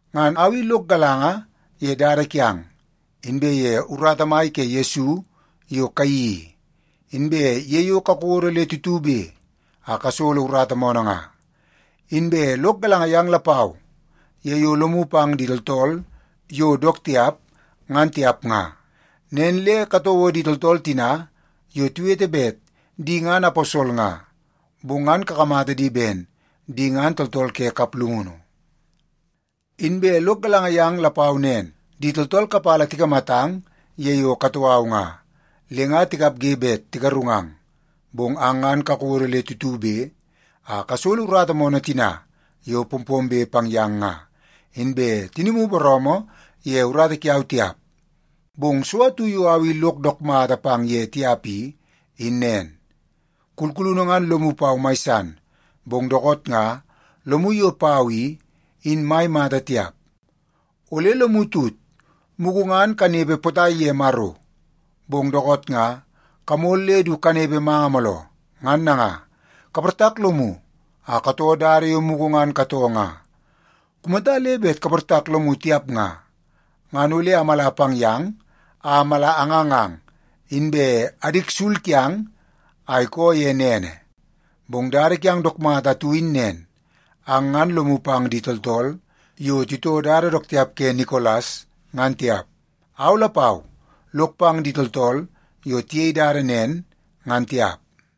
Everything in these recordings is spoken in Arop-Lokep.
Ngan au i lok galanga ye dada kiang, inbe ye urata mai ke Yesu yo kayeii i, inbe ye yo kakodo le tutube a kasolo urata moonoo nga. Inbe lok galanga yang lapau ye yo lomu pang di tooltool yo dook tiap, ngan tiap nga. Nen le katouo di tooltool tina yo tiwete bet di ngan aposol nga, bong ngan kakamata di ben di ngan tooltool ke kaplungunu. Inbe lok galanga yang lapau nen, di tooltool kapala tikamatang ye yo katoo au nga, le nga tikapge bet tigarungang. Bong ang ngan kakodo le tutube a kasolo urata moonoo tina yo pompombe pang yang nga, inbe tinimu booroomoo ye urata kiau tiap. Bong so atu yo au i lok dook mata pang ye tiap i, in nen. Kulkulunu ngan lomu pau mai san, bong dookoot nga lomu yo pau i, in mai mata tiap. Ole lomu tut, mugu ngan kanepe potai ye Maro, bong dookoot nga kamol le du kanepe manga mooloo. Ngan nanga, kaportak lomu a katoo dada yo mugu ngan katoo nga. Kumata le bet kaportak lomu tiap nga, ngan ole amala pang yang a mala angangang, inbe adik sul kiang a ikoo ye nene. Bong dada kiang dook mata atu in nen. Ang ngan lomu pang di tooltool yo titoo dada dook tiap ke Nikolas ngan tiap. Au lapau lok pang di tooltool yo tiyei dada nen ngan tiap.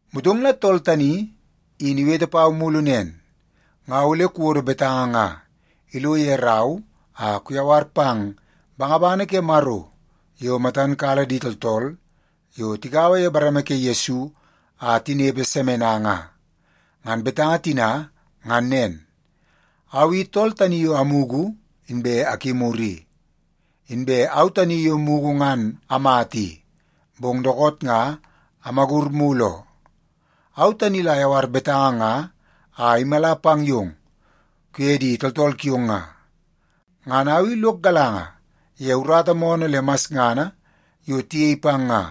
Motong la tool tani in iwete pau mulu nen, “Nga ole kuwodo betanga nga ilo ye rau a kuyawar pang bangabangana ke Maro yo matan kala di tooltool yo tigaua ye bareme ke Yesu a tinepe Semena nga. Ngan betanga tina ngan nen: Au i tool tani yo amugu inbe akimur i. Inbe au tani yo mugu ngan amata i, bong dookoot nga amagur mulu oo. Au tani la ayawar betanga nga a imala pang yong kuye di tooltool kiong nga. Ngan au i lok galanga ye urata moonoo le masngana yo tiyei pang nga.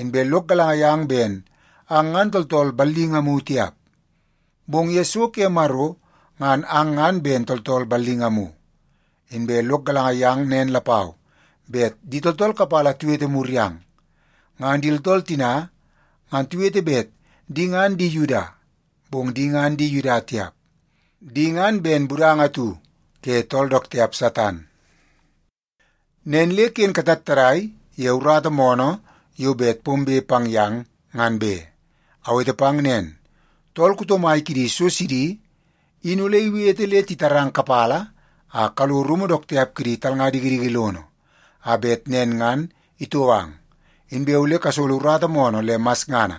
Inbe lok galanga yang ben ang ngan tooltool ballingamu tiap, bong ye so ke Maro ngan ang ngan ben tooltool ballingamu. Inbe lok galanga yang nen lapau bet di tooltool kapala tiwete mur yang. Ngan di tooltool tina ngan tiwete bet di ngan di Yuda, bong di ngan di Yuda tiap. Di ngan ben budanga atu ke tool dook tiap Satan. Nen le ken katattadai ye urata moonoo yo bet pombe pang yang, ngan be. Awete pang nen, tool kuto mai kidi so sidi in ole iwete le titarang kapala a kalo rumu dook tiap kidi talnga dikidiki lono, a bet nen ngan itou ang. Inbe ole kasolo urata moonoo le masngana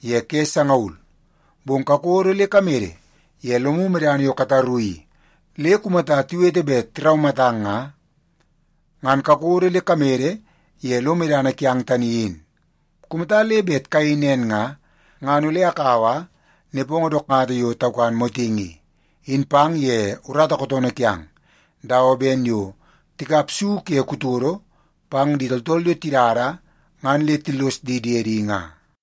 ye ke sangaul. Bong kakodo le kamede ye lomu medana yo kataru i le kumata tiwete bet tiraumatang nga, ngan kakodo le kamede ye lo medana kiang tani in. Kumata le bet kayei nen nga, ngan ole akaua nepongo dook mata yo taukan motingi i, in pang ye urata kootoonoo kiang, dawa ben yo tikap su ke kutodo pang di tooltool yo tidada ngan le tillos di diedi nga.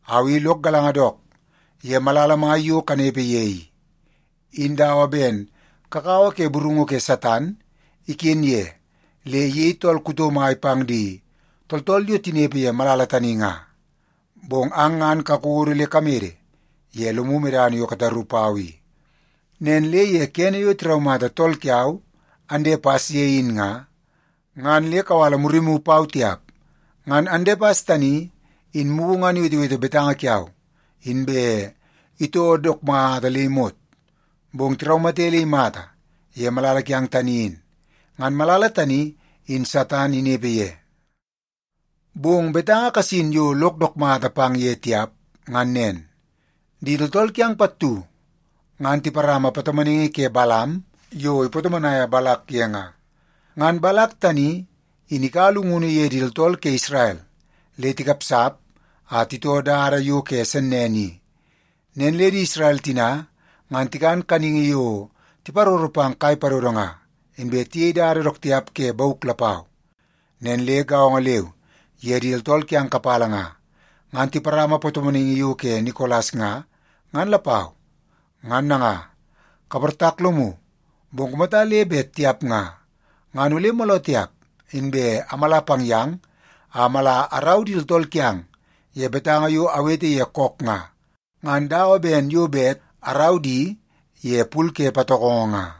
Au i lok galanga dook ye malala mai yo kanepe ye i, in dawa ben kakawa ke burungu ke Satan iken ye le iyei tool kuto mai pang di tooltool yo tinepe ye malala tani nga. Bong ang ngan kakodo le kamede ye lomu medana yo kataru pau i. Nen le ye kene yo tiraumata tool kiau, Andepas, ye in nga, ngan le kawala murimu pau tiap. Ngan Andepas tani in mugu ngan iwetewete betanga kiau inbe itoo dook mata le imot, bong tiraumate le imata ye malala kiang tani in. Ngan malala tani in Satan inepe ye. Bong betanga kasin yo lok dook mata pang ye tiap, ngan nen. Di tooltool kiang pattu ngan tiparama patomonaingi ke Balam yo ipatomonaia Balak ye nga. Ngan Balak tani in ikaua llungunu ye di tooltool ke Isrel le tikapsap a titoo dada yo ke sennene i. Nen le di Isrel tina ngan tikan kaningi yo tiparoro pang kai padodo nga, inbe tiyei dada dook tiap ke bauk lapau. Nen le gaongo leu ye di tooltool kiang kapala nga, ngan tiparama patomonaingi yo ke Nikolas nga, ngan lapau. Ngan nanga, kaportak lomu! Bong kumata le bet tiap nga, ngan ole mooloo tiap inbe amala pang yang a mala arau di tooltool kiang ye betanga yo awete ye kook nga, ngan dawa ben yo bet arau di ye pul ke patokongo nga.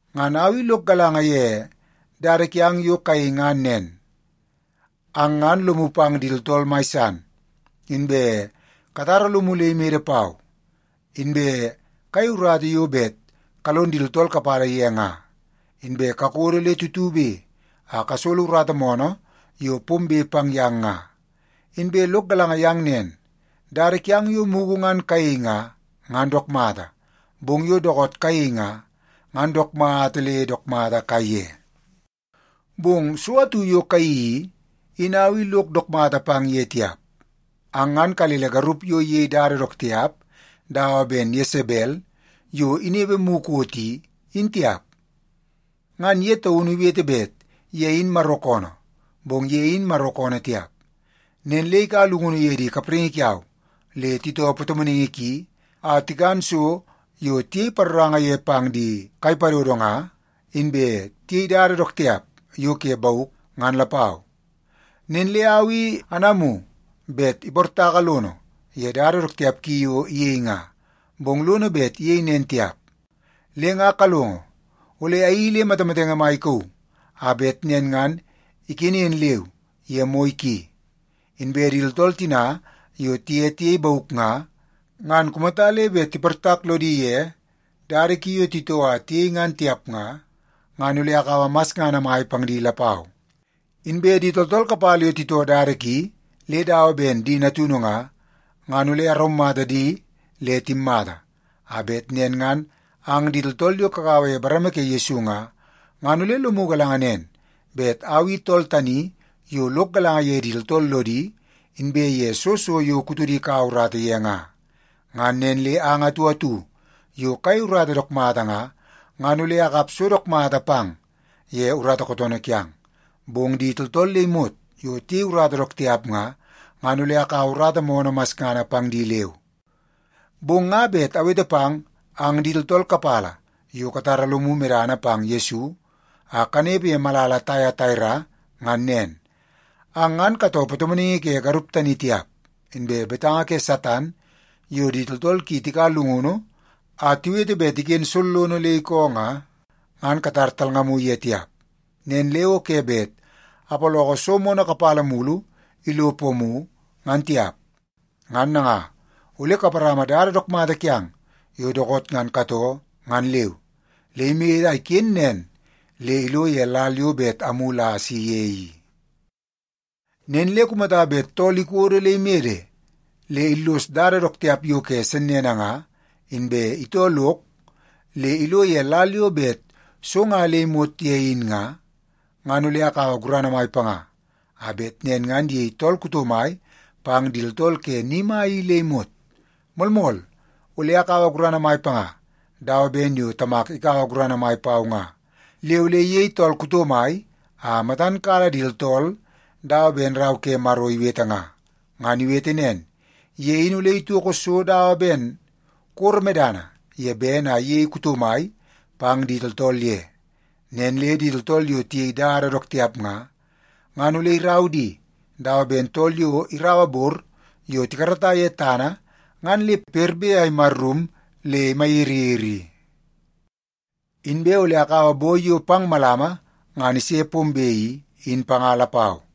Ngan au i lok galanga ye dada kiang yo kayei ngan nen. Ang ngan lomu pang di tooltool mai san, inbe katara lomu le imede pau, inbe kayei urata yo bet kalon di tooltool kapala ye nga, inbe kakodo le tutube a kasolo urata moonoo yo pombe pang yang nga. Inbe lok galanga yang nen, dada kiang yo mugu ngan kayei nga, ngan dook mata, bong yo dookoot kayei nga, ngan dook mata le dook mata kaiye. Bong so atu yo kayeii i, in au i lok dook mata pang ye tiap. Ang ngan kalele garup yo iyei dada dook tiap dawa ben Yesebel yo inepe mukot i, in tiap. Ngan ye taunu iwete bet ye in Maro koonoo, bong ye in Maro koonoo tiap. Nen le ikaua llungunu ye di kapraingi kiau le titoo patomonaingi ki a tikan so yo tiyei paroranga ye pang di kai padodo nga, inbe tiyei dada dook tiap yo ke bauk, ngan lapau. Nen le au i anamu bet iportaka lono ye dada dook tiap ki yo iyei nga, bong lono bet iyei nen tiap. Le nga kalongo, ole ayeii le matamatenge mai ikauu a bet nen ngan ikenen leu ye moi ki. Inbe di tooltool tina yo tiye tiyei bauk nga, ngan kumata le bet tiportak lodi ye dada ki yo titoo a tiyei ngan tiap nga, ngan ole akaua masngana mai pang di lapau. Inbe di tooltool kapala yo titoo dada ki le dawa ben di natunu nga, ngan ole araumata di le timmata, a bet nen ngan ang di tooltool yo kagaua ye bareme ke Yesu nga, ngan ole lomu galanga nen bet au i tool tani yo lok galanga ye di tooltool lodi inbe ye soo so yo kutodi ikaua urata ye nga. Ngan nen le ang atu atu yo kayei urata dook mata nga, ngan ole akap so dook mata pang ye urata kootoonoo kiang. Bong di tooltool le imot yo tiyei urata dook tiap nga, ngan ole akaua urata moonoo masngana pang di leu. Bong nga bet awete pang ang di tooltool kapala yo katara lomu medana pang Yesu a kanepe ye malala Taiataira ngan nen. Ang ngan katoo patomonaingi ke garup tani tiap. Inbe betanga ke Satan yo di tooltool ki tikaua llungunu a tiwete bet iken sollono le iko nga, ngan katar talngamu ye tiap. Nen le o ke bet apaloko so moonoo kapala mulu ilo pomu, ngan tiap. Ngan nanga, ole kaparama dada dook mata kiang yo dookoot ngan katoo ngan leu le imede a iken nen le ilo ye lal yo bet amulu a asi ye i. “Nen le kumata bet tool ikodo le imede le illos dada dook tiap yo ke sennene nga, inbe itoo lok le ilo ye lal yo bet so nga imot ye in nga, ngan ole akaua gurana mai panga, a bet nen ngan iyei tool kuto mai pang di tooltool ke ni mai i le imot. Moolmool, ole akaua gurana mai panga dawa ben yo Tamak ikaua gurana mai pau nga. Le ole iyei tool kuto mai a matan kala di tooltool dawa ben Rau ke Maro iwete nga. Ngan iwete nen, ‘Ye in ole itoko so dawa ben koro medana ye bene a iyei kuto mai pang di tooltool ye. Nen le di tooltool yo tiyei dada dook tiap nga, ngan ole irau di dawa ben tool yo iraua bor yo tikarata ye tana ngan le perbe a imarrum le imayiriyiri i.’ Inbe ole akaua boi yo pang malama ngan ise pombe i, in panga lapau.